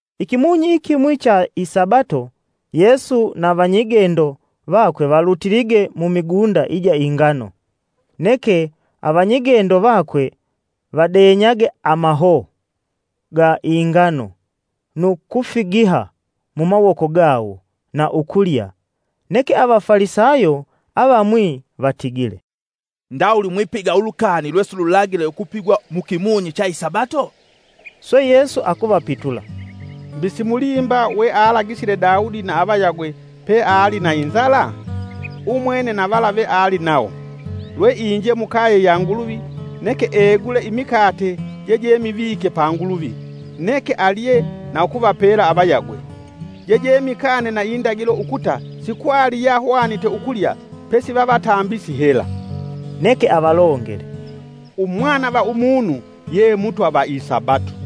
Ikimunyi ikimwi cha isabato, Yesu na vanyigendo vakwe valutilige mumigunda ija ingano, neke avanyigendo vakwe vadenyage amahoo ga ingano nu kufigiha mumawoko gawo na ukulya. Neke avafalisayo avamwi vatigile, “Ndawuli mwipiga ulukani lwesilulagile ukupigwa mukimunyi cha isabato?” Swe Yesu akuvapitula, “Mbi simulimba wealagisile Daudi na avayagwe peali na inzala? Umwene na vala veali nawo. Lwe inje mukaye ya Nguluvi, neke egule imikate jejemivike pa Nguluvi, neke alye na ukuvapela avayagwe. Jejemikane na indagilo ukuta sikwali yahwanite ukulya pesi vavatambisi hela.” Neke avalongele, “Umwana va Umunu ye Mutwa va isabato.”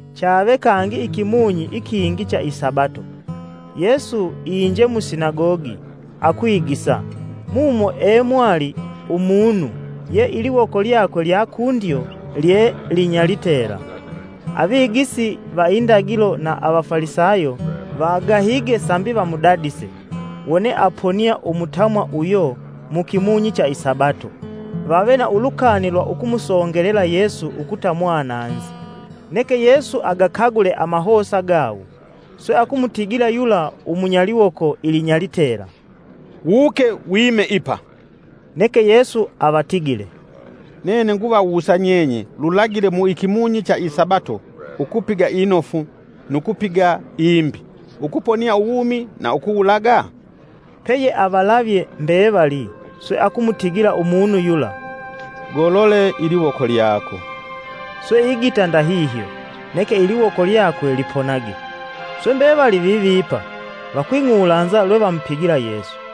Chave kangi ikimunyi ikingi cha isabato, Yesu inje musinagogi akwigisa, mumo e mwali umunu ye iliwoko lyakwe lya kundyo lye linyalitela. Avigisi va indagilo na avafalisayo vagahige sambi vamudadise, wone aponia umutamwa uyo mu kimunyi cha isabato vave na ulukani lwa ukumusongelela Yesu ukuta mwananzi. Neke Yesu agakagule amahosa gawo, swe akumutigila yula umunyaliwoko ilinyalitela, “Wuke wime ipa.” Neke Yesu avatigile, “Nene nguvawusa nyenye lulagile mu ikimunyi cha isabato ukupiga inofu nu kupiga imbi, ukuponia uwumi na ukuwulaga?” Peyeavalavye mbevali swe akumutigila umunu yula, “Golole iliwoko lyako.” Swe igita ndahihyo, neke iliwoko lyakwe liponage. Swe mbevali vivipa, vakwing'ulanza lwe vamupigila Yesu.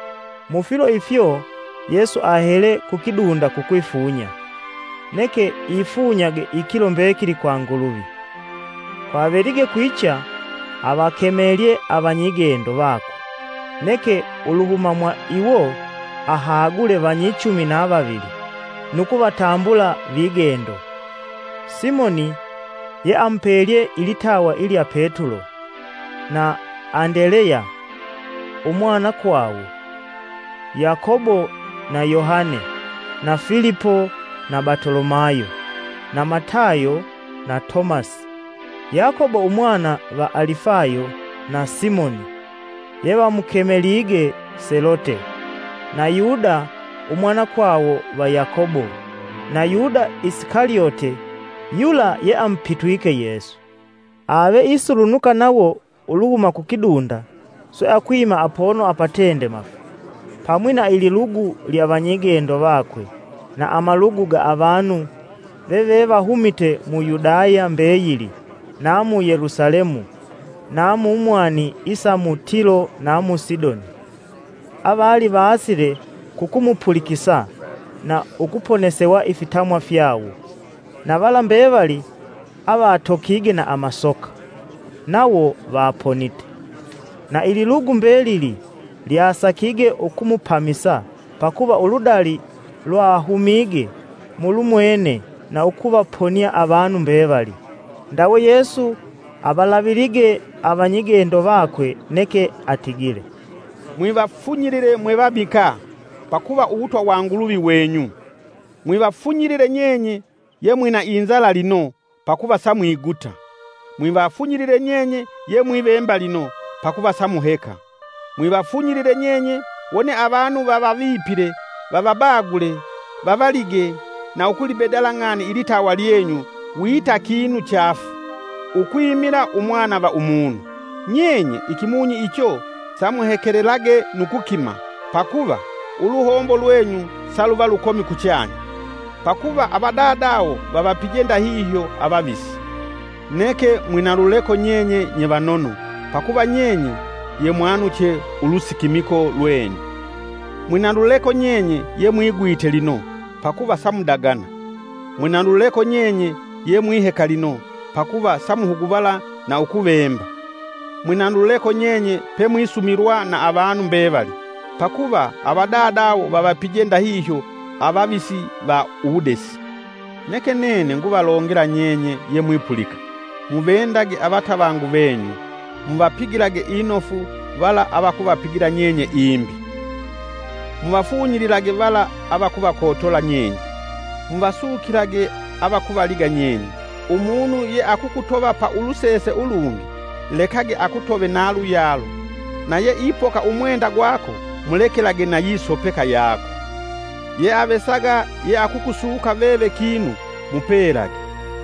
Mufilo ifyo Yesu ahele kukidunda kukwifunya, neke ifunyage ikilo mbekili kwa Nguluvi. Kwavelige kwicha, avakemelye avanyigendo vakwe, neke uluhuma mwa iwo ahagule vanyichumi na vavili, nu kuvatambula vigendo: Simoni, (ye amupelye ilitawa ilya Petulo), na Andeleya umwanakwawo, Yakobo na Yohane, na Filipo, na Batolomayo, na Matayo, na Tomasi, Yakobo umwana va Alifayo na Simoni (yevamukemelige Selote), na Yuda umwanakwawo va Yakobo, na Yuda Isikalyote yula yeamupitwike Yesu. Ave isulunuka nawo uluhuma kukidunda swe akwima apono apatendemafu, pamwi na ililugu lya vanyigendo vakwe na amalugu ga avanu veve vahumite mu Yudaya mbeyili na mu Yelusalemu na mu mwani isa mu Tilo na mu Sidoni. Avali vaasile kukumupulikisa na ukuponesewa ifitamwa fyawo. Na vala mbevali avatokige na amasoka nawo vaponite. Na ililugu mbelili lyasakige ukumupamisa, pakuva uludali lwahumige mulumwene na ukuvaponia avanu mbevali. Ndawe Yesu avalavilige avanyigendo vakwe, neke atigile: “Mwivafunyilile mwevamikaa, pakuva Uwutwa wa Nguluvi wenyu. Mwivafunyilile nyenye ye mwina inzala lino, pakuva samwiguta. Mwivafunyilile nyenye yemwivemba lino, pakuva samuheka. Mwivafunyilile nyenye wone avanu vavavipile, vavabagule, vavalige na ukulibedalila ng'ani ilitawa lyenyu wita kinu chaafu, ukwimila Umwana va Umunu. Nyenye ikimunyi icho samuhekelelage nu kukima, pakuva, uluhombo lwenyu saluva lukomi kuchanya. Pakuva avadadawo vavapije ndahihyo avavisi. Neke mwinaluleko nyenye nye vanono, pakuva nyenye yemwanuche ulusikimiko lwenyu. Mwinaluleko nyenye yemwigwita lino, pakuva samudagana. Mwinaluleko nyenye yemwiheka lino, pakuva samuhuguvala na ukuvemba. Mwinaluleko nyenye, pemwisumilwa na avanu mbevali, pakuva avadadawo vavapije ndahihyo avavisi va uwudesi. “Neke nene nguvalongela nyenye yemwipulika, muvendage avatavangu venyu muvapigilage inofu vala avakuvapigila nyenye. Muvafunyililage vala avakuvakotola nyenye, muvasukilage avakuvaliga nyenye. Umunu yeakukutova pa ulusese ulungi, lekage akutove na luyalo, na yeipoka umwenda gwako mulekelage na yisopeka yako. Yeavesaga yeakukusuka veve kinu mupelage,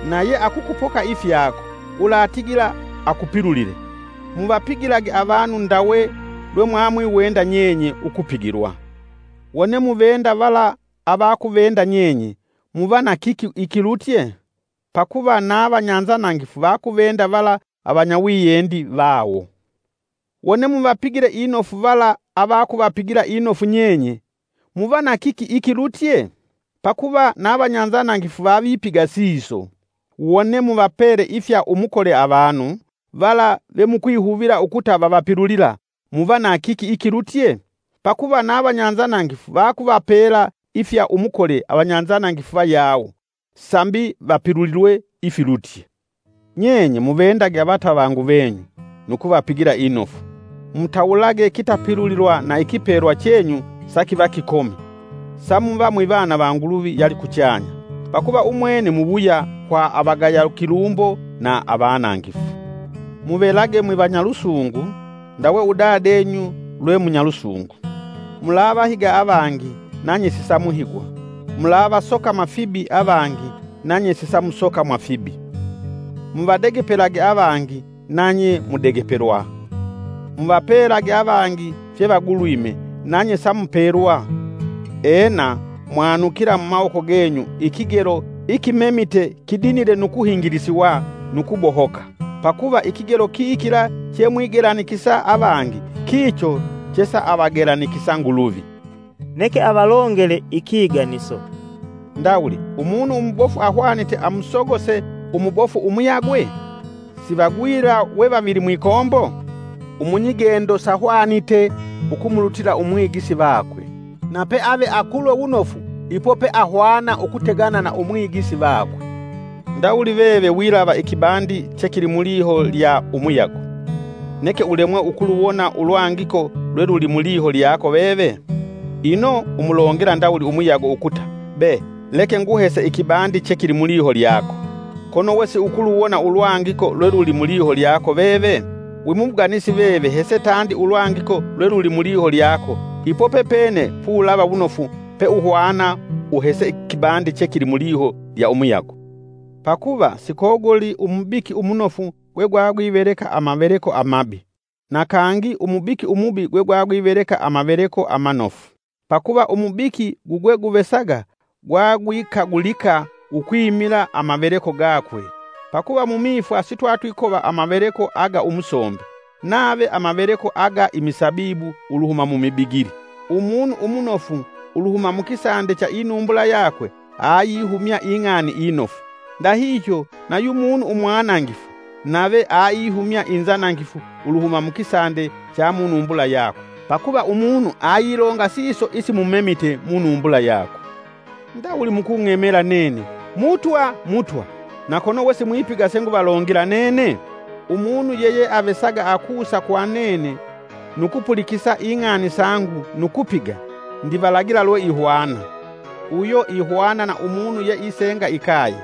na yeakukupoka ifyako, ulatigila akupilulile. Muvapigilage avanu ndawe lwemwiwenda nyenye ukupigilwa. “Wone muvende vala avakuvenda nyenye muva na kiki ikilutye? Pakuva na vanyanzanangifu vakuvenda vala avanyawiyendi vawo. Wone muvapigile inofu vala avakuvapigila inofu nyenye, muva na kiki ikilutye? Pakuva na vanyanzanangifu vavipiga siso. Wone muvapele ifya umukole avanu vala vemukwihuvila ukuta vavapilulila muva na kiki ikilutye? Pakuva na vanyanzanangifu vakuvapela ifya umukole avanyanzanangifu vayawo, sambi vapilulilwe ifilutye. Nyenye muvendage avatavangu venyu, nu kuvapigila inofu, mutawulage kitapilulilwa, na ikipelwa chenyu sakiva kikomi, samuva mwivana va Nguluvi yalikuchanya. Pakuva umwene muwuya kwa avagaya kilumbo na avanangifu. Muvelage mwivanyalusungu, ndawe Dadenyu lwe munyalusungu. “Mulavahiga avangi nanye sisamuhigwa, mulavasokama fibi avangi nanye sisamusokamwa fibi, muvadegepelage avangi nanye mudegepelwa. Muvapelage avangi fyevagulwime nanye samupelwa. Ena, mwanukila mumawoko genyu ikigelo ikimemite kidinile nu kuhingilisiwa nu kubohoka, pakuva ikigelo kikila chemwigelanikisa avangi kicho chesaavagelanikisa Nguluvi.” Neke avalongele ikiganiso: “Ndawuli umunu umubofu ahwanite amusogose umubofu umuyagwe? Sivagwila we vavili mwikombo? Umunyigendo sahwanite ukumulutila umwigisi vakwe, na pe ave akulwe wunofu ipo peahwana ukutegana na umwigisi vakwe. Ndawuli veve wilava ikibandi chekili muliho lya umuyago, neke ulemwe ukuluwona ulwangiko lweluli muliho lyako veve? Ino umulongela ndawuli umuyago ukuta, ‘Be! Leke nguhese ikibandi chekili muliho lyako.’ Kono wesiukuluwona ulwangiko lweluli muliho lyako veve? Wimubuganisi veve hese tandi ulwangiko lweluli muliho lyako ipo pepene pulava wunofu peuhwana uhese ikibandi chekili muliho lya umuyago. “Pakuva Sikoguli umubiki umunofu gwegwagwiveleka amaveleko amabi, na kangi umubiki umubi gwegwagwiveleka amaveleko amanofu. Pakuva umubiki gugweguvesaga gwagwikagulika ukwimila amaveleko gakwe. Pakuva mumifwa sitwatwikova amaveleko aga umusombe, nave amaveleko aga imisabibu uluhuma mumibigili. Umunu umunofu uluhuma mukisande cha inumbula yakwe ayihumya ing'ani inofu, ndahihyo na yumunu umwanangifu, nave aihumya inzanangifu uluhuma mukisande cha munumbula yakwe, pakuva umunu ayilonga siso isimumemite munumbula yakwe. “Ndawuli mukung'emela nene, ‘Mutwa, Mutwa’, na kono we simwipiga senguvalongela nene? Umunu yeyeavesaga akusa kwa nene nu kupulikisa ing'ani sangu nu kupiga, ndivalagila lwe ihwana: uyo ihwana na umunu yeisenga ikaye,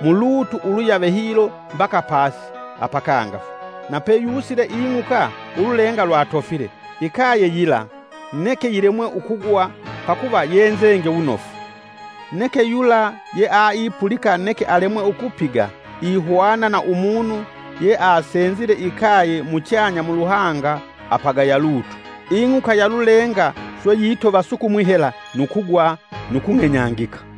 mulutu uluyave hilo mbaka pasi apakangafu na peyusile ing'uka ululenga lwatofile; ikaye yila, neke yilemwe ukugwa pakuva yenzenge wunofu. Neke yula yeaipulika neke alemwe ukupiga ihwana na umunu yeasenzile ikaye muchanya muluhanga apagaya lutu. Ing'uka ya lulenga swe yitova sukumwi hela nu kugwa, nu kung'enyangika!”